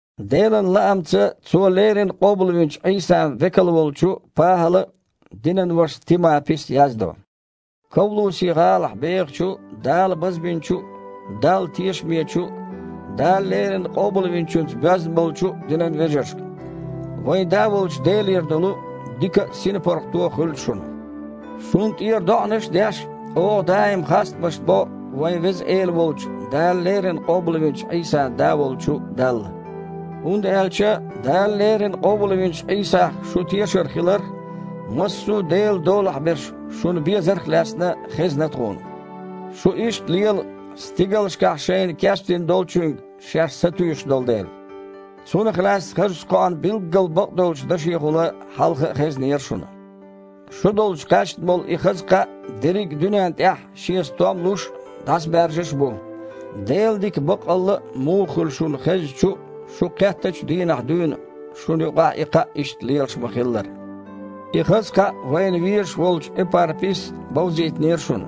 Делан лаамца Цо леррина къобалвинчу Іийсан векал волчу ПахІала а, динан вашас Тимапис а яздо Ковлуси-гІалахь бехачу Дала базбинчу а, Далла тешамечу а, Дала леррина Къобалвинчуьнца боьзна а болчу динан вежаршка. Вайн Да волчу Делера долу дика а, синпаргІато а хуьлда шуна. Шуна тІера доІанаш а деш, оха даим хастамаш бо вайн Веза Эла волчу, Дала леррина къобалвинчу Іийсан Да волчу Далла. ХІунда аьлча Дала леррина къобалвинчу Іийсах шун тешар хиларх а, массо а Делан долахь берш шуна безарх а лаьцна хезна тхуна. Шу иштта лела, стигалшкахь шайна кечдина долчуьнга шаьш сатуьйсуш долу дела. Цунах лаьцна хазачу кхоан билггал бакъдолчу дашехула хьалха а хезнера шуна. Шу долчу кхаьчна болу и хаза кхаъ дерриг а дуьнен тІехь шен стом луш а, дІасабаьржаш а бу, Делан дика баккъалла а муха хуьлу шуна хезначу а, шу кхеттачу а дийнахь дуьйна, шуна юкъахь и кхаъ иштта лелаш ма-хиллара. И хаза кхаъ вайна везаш волчу Эпарпис бовзийтинера шуна.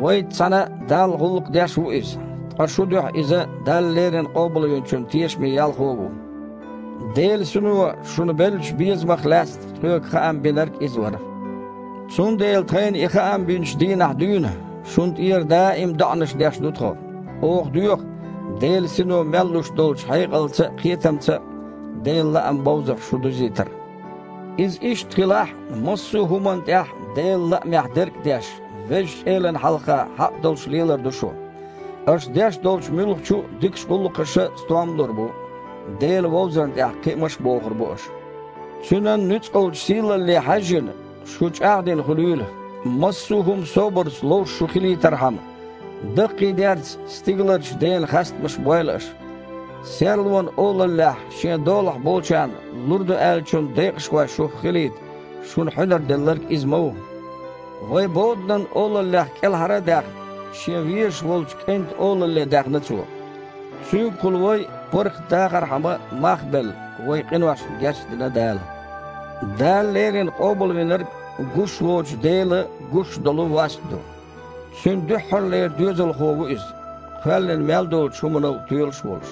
Вайца цхьаьна Далла гІуллакх деш ву иза, ткъа шун дуьхьа иза Дала леррина Къобалвинчун тешаме ялхо а ву. Делан Сино шуна беллачу безамах лаьцна тхоьга хаам бинарг а иза вара. Цундела тхайна и хаам бинчу дийнахь дуьйна, шуна тІера даим доІанаш деш ду тхо. Оха доьху, Делан Сино мел луш долчу хьекъалца а, кхетамца а Делан лаам бовзарх шу дузийтар. Иза иштта хилахь, массо а хІуманна тІехь Делан лаамехь дерг а деш, Везачу Элана хьалха хьакъ долуш лелар ду шу. Аша деш долчу муьлххачу а дикачу гІуллакхаша стом а лур бу, Дела вовзарна тІехь кхиамаш а бохур бу аша. Цуьнан нуьцкъалчу сийлалле хьаьжжина, шу чІагІдина хуьлийла, массо а хІума собарца ловш шу хилийтархьама. Даккхийдерца стигаларчу Дена хастамаш бойла аша. Серлонан олаллехь Шен долахь болчарна лур ду аьллачун декъашхой шух хилийта, шуна хьуьнар Делларг Иза ма ву. Вай, боданан олаллех кІелхьара а даьхна, Шен везаш волчу КІентан олалле даьхна Цо. Цуьнгахула вай паргІатдахархьама мах а белла, вайн къиношна гечдина Дала. Дала леррина Къобалвинарг – гуш воцучу Делан гуш долу васт ду. Цуьнан дуьххьарлера Доьзалхо ву Иза, кхоьллина мел долчу хІуманал тоьлуш а волуш.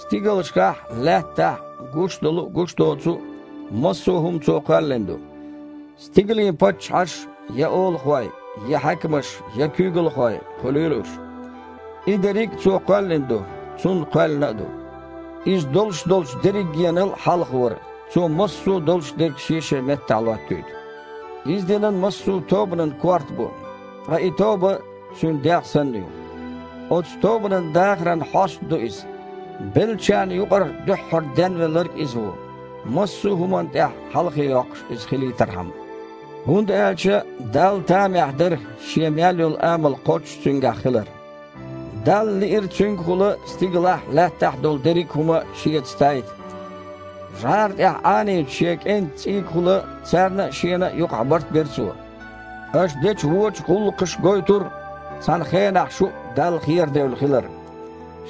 Стигалшкахь а, лаьттахь а гуш долу а, гуш доцу а массо а хІума Цо кхоьллина ду: стигалийн паччахьаш, я олахой, я хьаькамаш, я куьйгалхой хуьлийла уьш. И дерриг а Цо кхоьллина а ду, Цунна кхоьллина а ду. Иза долуш долчу дерригенал а хьалха вара, Цо массо а долуш дерг шен-шен меттехь лоттуьйту. Иза динан массо а тобанан Корта бу, ткъа и тоба Цуьнан дегІ санна ю. Оцу тобанан дахаран хьоста ду Иза. Беллачарна юкъара дуьххьара денвелларг а Иза ву, массо а хІуманна тІехь хьалхе йоккхуш Иза хилийтархьама. ХІунда аьлча Далла тамехь дара Шен мел йолу амал кхоччуш Цуьнгахь хилар. Далла лиира Цуьнгахула стигалахь а, лаьттахь а долу дерриг а хІума Шеца тайта. ЖІара тІехь Іанийначу Шен КІентан цІийгахула царна а, Шена а юкъахь барт бира Цо. Аша дечу вочу гІуллакхаша гойтура, цхьана хенахь шу а Далла херадевлла хилар.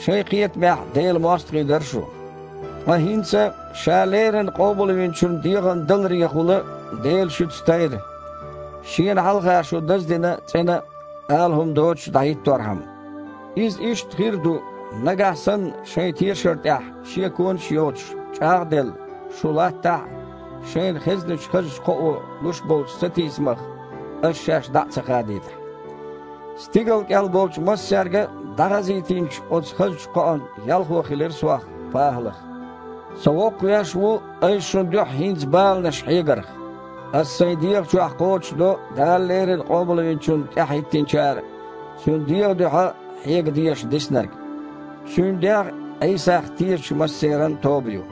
Шайн кхетамехь Делан мостагІий дара шу. Ткъа хІинца, Ша леррина Къобалвинчун дегІан даларехула, Дела шуьца тайра, Шена хьалха шу даздина а, цІена а, ала хІума доцуш а дІахІитторхьама. Иза иштта хир а ду, нагахь санна шайн тешар тІехь шеконаш а йоцуш, чІагІ а делла, шу латтахь а, шайна хезначу хазачу кхоо луш болчу сатийсамах аша шаьш дІа ца хадийтахь а. Стигал кІел болчу массаьрга а дІахазийтинчу оцу хазачу кхоан ялхо хилира сох, ПахІалах. Со воккхавеш ву айса шун дуьхьа хІинца баланаш хьегарх. Аса сайн дегІа чохь кхочушдо Дала леррина Къобалвинчунна тІаьхьахІиттинчара Цуьнан дегІан дуьхьа хьега дезаш диснарг. Цуьнан дегІ – Іийсах тешачу массеран а тоба ю.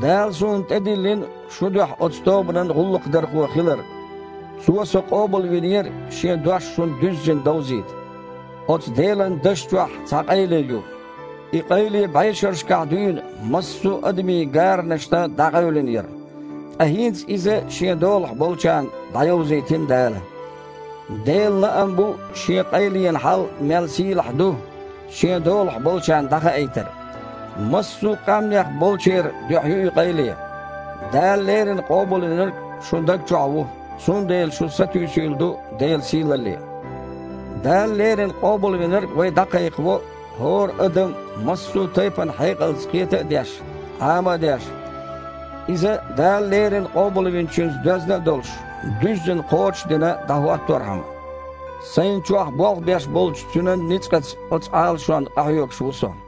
Дала суна тІедиллина шун дуьхьа оцу тобанан гІуллакхдархо хилар. Цо со къобалвинера Шен дош шуна дуьззина довзийта. Оцу Делан дашна чохь цхьа къайле ю. И къайле бІешерашкахь дуьйна массо а адамийн гаранашна дІакъевлина яра. Ткъа хІинца иза Шен долахь болчарна дІайовзийтина Дала. Делан лаам бу Шен къайленан хьал мел сийлахь ду Шен долахь болчарна дІахаийтар. Массо а къаьмнех болчеран дуьхьа ю и къайле: Дала леррина Къобалвинарг шун даг чохь ву, цундела шун сатуьйсийла ду Делан сийлалле. Дала леррина Къобалвинарг вай дІакхайкхаво, хІора адам, массо а тайпана хьекъалца кхета а деш, Іама а деш, иза, Дала леррина Къобалвинчуьнца доьзна а долуш, дуьззина кхочуш а дина, дІахІотторхьама. Сайна чохь болх беш болчу Цуьнан ницкъаца оцу Іалашонна къахьоьгуш ву со.